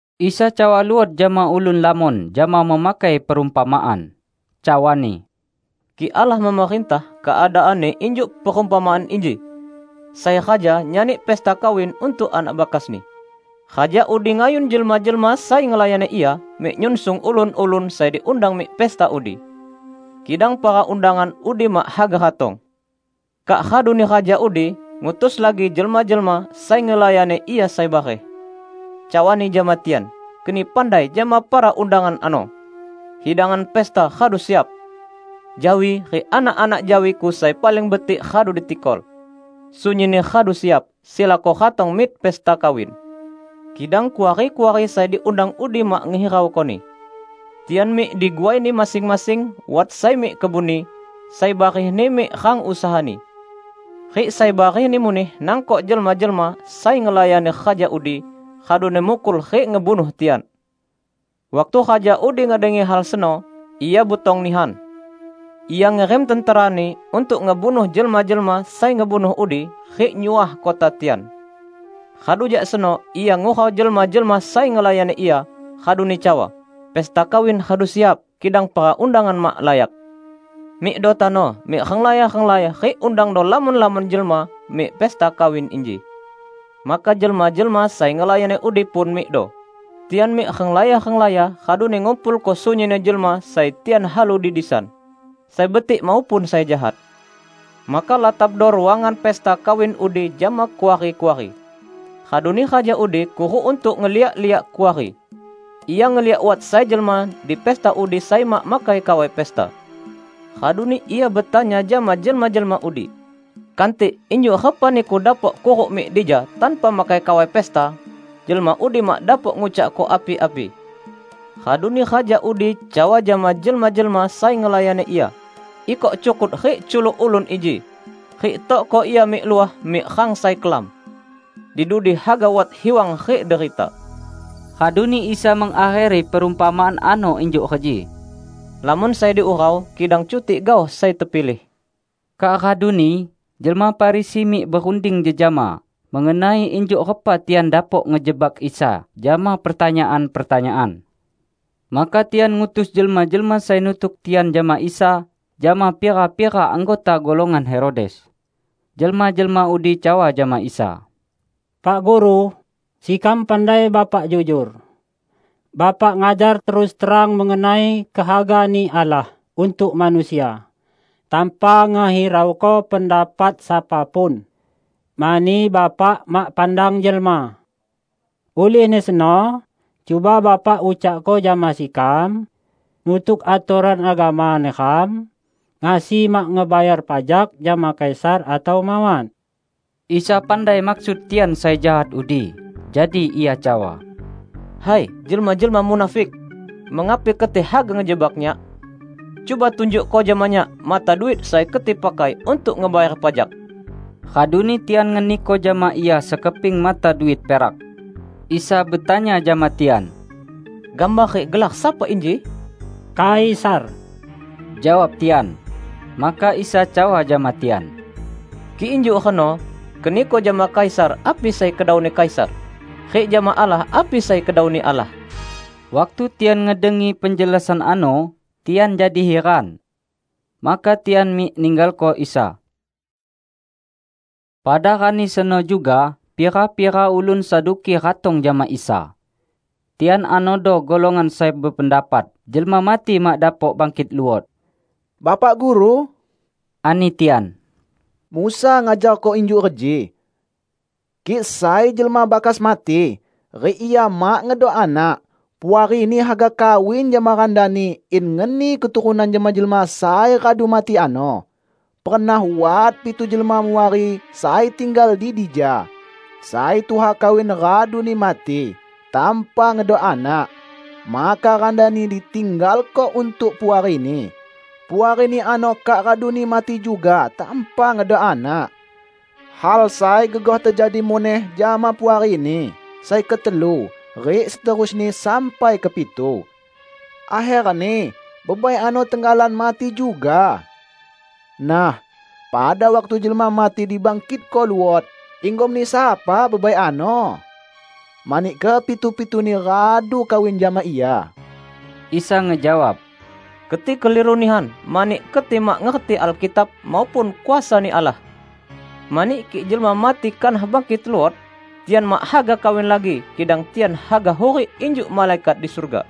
Isa cawa luot jama ulun lamon jama memakai perumpamaan, cawa-Ni, "Kik Allah memerintah, keadaanni injuk perumpamaan inji: Sai raja nyani pesta kawin untuk anak bakasni. Raja udi ngayun jelma-jelma sai ngelayani ia mik nyunsung ulun-ulun sai diundang mik pesta udi. Kidang para undangan udi mak haga ratong. Kak raduni raja udi ngutus lagi jelma-jelma sai ngelayani ia sai bareh. Cawani jama tian: 'Keni pandai jama para undangan ano: Hidangan pesta radu siap. Jawi, rik anak-anak jawiku sai paling betik radu ditikol. Sunyinni radu siap. Silako ratong mik pesta kawin!' Kidang kuari-kuari sai diundang udi mak ngehiraukoni. Tian mik diguaini masing-masing -- wat sai mik kebunni, sai barehni mik rang usahani; rik sai barehni muneh nangkok jelma-jelma sai ngelayani raja udi, raduni mukul rik ngebunuh tian. Waktu raja udi ngedengi hal seno, ia butong nihan. Ia ngirim tenterani untuk ngebunuh jelma-jelma sai ngebunuh udi, rik nyuah kota tian. Radu jak seno ia ngurau jelma-jelma sai ngelayani ia, raduni cawa, 'Pesta kawin radu siap, kidang para undangan mak layak. Mikdo tano mik renglaya-renglaya rik undangdo lamon-lamon jelma mik pesta kawin inji.' Maka jelma-jelma sai ngelayani udi pun mikdo. Tian mik renglaya-renglaya raduni ngumpulko sunyinni jelma sai tian halu di disan, sai betik maupun sai jahat. Maka latapdo ruangan pesta kawin udi jama kuari-kuari. Raduni raja udi kuruk untuk ngeliak-liak kuari. Ia ngeliak wat sai jelma di pesta udi sai mak makai kawai pesta. Raduni ia betanya jama jelma-jelma udi, 'Kantik, injuk repa niku dapok kuruk mik dija tanpa makai kawai pesta?' Jelma udi mak dapok ngucakko api-api. Raduni raja udi cawa jama jelma-jelma sai ngelayani ia, 'Ikok cukut rik culuk ulun inji, rik tokko ia mik luah mik rang sai kelam. Di dudi haga wat hiwang rik derita.' " Raduni Isa mengakheri perumpamaan ano injuk reji, "Lamon sai diurau, kidang cutik gaoh sai tepilih." Kak raduni jelma Farisi mik berunding jejama mengenai injuk repa tian dapok ngejebak Isa jama pertanyaan-pertanyaan. Maka tian ngutus jelma-jelma sai nutuk tian jama Isa jama pira-pira anggota golongan Herodes. Jelma-jelma udi cawa jama Isa, "Pak Guru, sekam pandai Bapak jujor. Bapak ngajar terus terang mengenai kehaga-Ni Allah untuk manusia, tanpa ngehirauko pendapat sapa pun. Mani Bapak mak pandang jelma. Ulihni seno, cuba Bapa ucakko jama sekam: Nutuk atoran agama neram, ngasi mak ngebayar pajak jama Kaisar atau mawat?" Isa pandai maksud tian sai jahat udi, jadi Ia cawa, "Hai, jelma-jelma munafik! Mengapi keti haga ngejebak Nyak? Cuba tunjukko jama Nyak mata duit sai keti pakai untuk ngebayar pajak!" Raduni tian ngeniko jama Ia sekeping mata duit perak. Isa betanya jama tian, "Gambar rik gelar sapa inji?" "Kaisar," jawab tian. Maka Isa cawa jama tian, "Kik injuk reno, keniko jama Kaisar api sai kedauni Kaisar, rik jama Allah api sai kedau-Ni Allah." Waktu tian ngedengi penjelasan ano, tian jadi hiran. Maka tian mik ninggalko Isa. Pada rani seno juga, pira-pira ulun Saduki ratong jama Isa. Tian anodo golongan sai bependapat jelma mati mak dapok bangkit luot. "Bapak Guru," ani tian, "Musa ngajarko injuk reji: Kik sai jelma bakas mati, rik ia mak ngedok anak, puarini haga kawin jama randani in ngeni keturunan jama jelma sai radu mati ano. Pernah wat pitu jelma muari sai tinggal di dija. Sai tuha kawin raduni mati tanpa ngedok anak. Maka randani ditinggalko untuk puarini. Puarini ano kak raduni mati juga tanpa ngedok anak. Hal sai gegoh tejadi muneh jama puarini sai ketelu rik seterusni sampai kepitu. Akherni bebai ano tenggalan mati juga. Nah, pada waktu jelma mati dibangkitko luot, inggomni sapa bebai ano? Mani kepitu-pituni radu kawin jama ia." Isa ngejawab, "Keti keliru nihan, mani keti mak ngerti Alkitab, maupun kuasa-Ni Allah. Mani kik jelma mati kanah bangkit luot, tian mak haga kawin lagi, kidang tian haga hurik injuk malaikat di surga.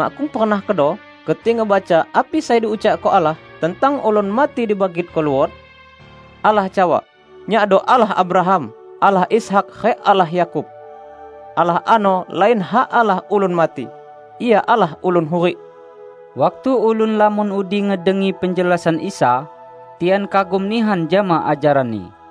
Makkung pernah kedo keti ngebaca api sai diucakko Allah tentang ulun mati dibangkitko luot? Allah cawa, 'Nyakdo Allah Abraham, Allah Ishak rik Allah Yakub.' Allah ano lain hak Allah ulun mati. Ia Allah ulun hurik!" Waktu ulun lamon udi ngedengi penjelasan Isa, tian kagum nihan jama ajaran-Ni.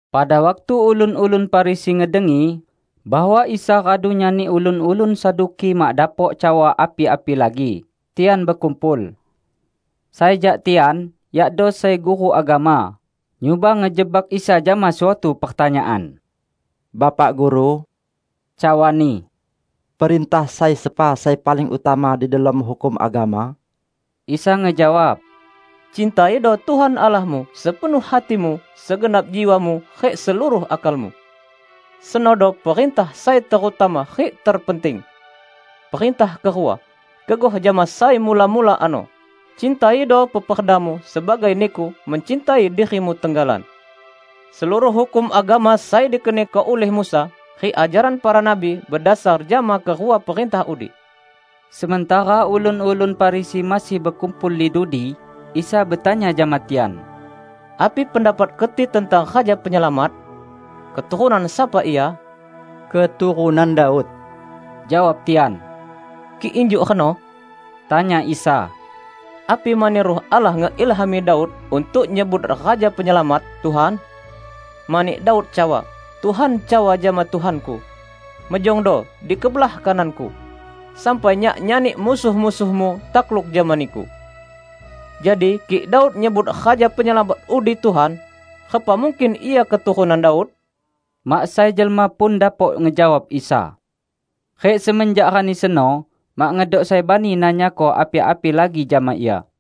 Pada waktu ulun-ulun Farisi ngedengi bahwa Isa radu nyani ulun-ulun Saduki mak dapok cawa api-api lagi, tian bekumpul. Sai jak tian, yakdo sai guru agama, nyuba ngejebak Isa jama suatu pertanyaan. "Bapak Guru," cawani, "perintah sai sepa sai paling utama di delom hukum agama?" Isa ngejawab, "Cintaido Tuhan Allahmu sepenuh hatimu, segenap jiwamu, rik seluruh akalmu. Senodo perintah sai terutama rik terpenting! Perintah kerua, gegoh jama sai mula-mula ano: Cintaido peperdamu sebagai niku mencintai dirimu tenggalan. Seluruh hukum agama sai dikeniko ulih Musa rik ajaran para nabi bedasar jama kerua perintah udi." Sementara ulun-ulun Farisi masih bekumpul di dudi, Isa betanya jama tian, "Api pendapat keti tentang Raja Penyelamat? Keturunan sapa Ia?" "Keturunan Daud," jawab tian. "Kik injuk reno," tanya Isa, "api mani Ruh Allah ngeilhami Daud untuk nyebut Raja Penyelamat 'Tuhan'? Mani Daud cawa, 'Tuhan cawa jama Tuhanku: mejongdo di kebelah kanan-Ku, sampai Nyak nyani musuh-musuh-Mu takluk jama Niku.' Jadi kik Daud nyebut Raja Penyelamat udi 'Tuhan', repa mungkin Ia keturunan Daud?" Mak sai jelma pun dapok ngejawab Isa. Rik semenjak rani seno, mak ngedok sai bani nanyako api-api lagi jama Ia.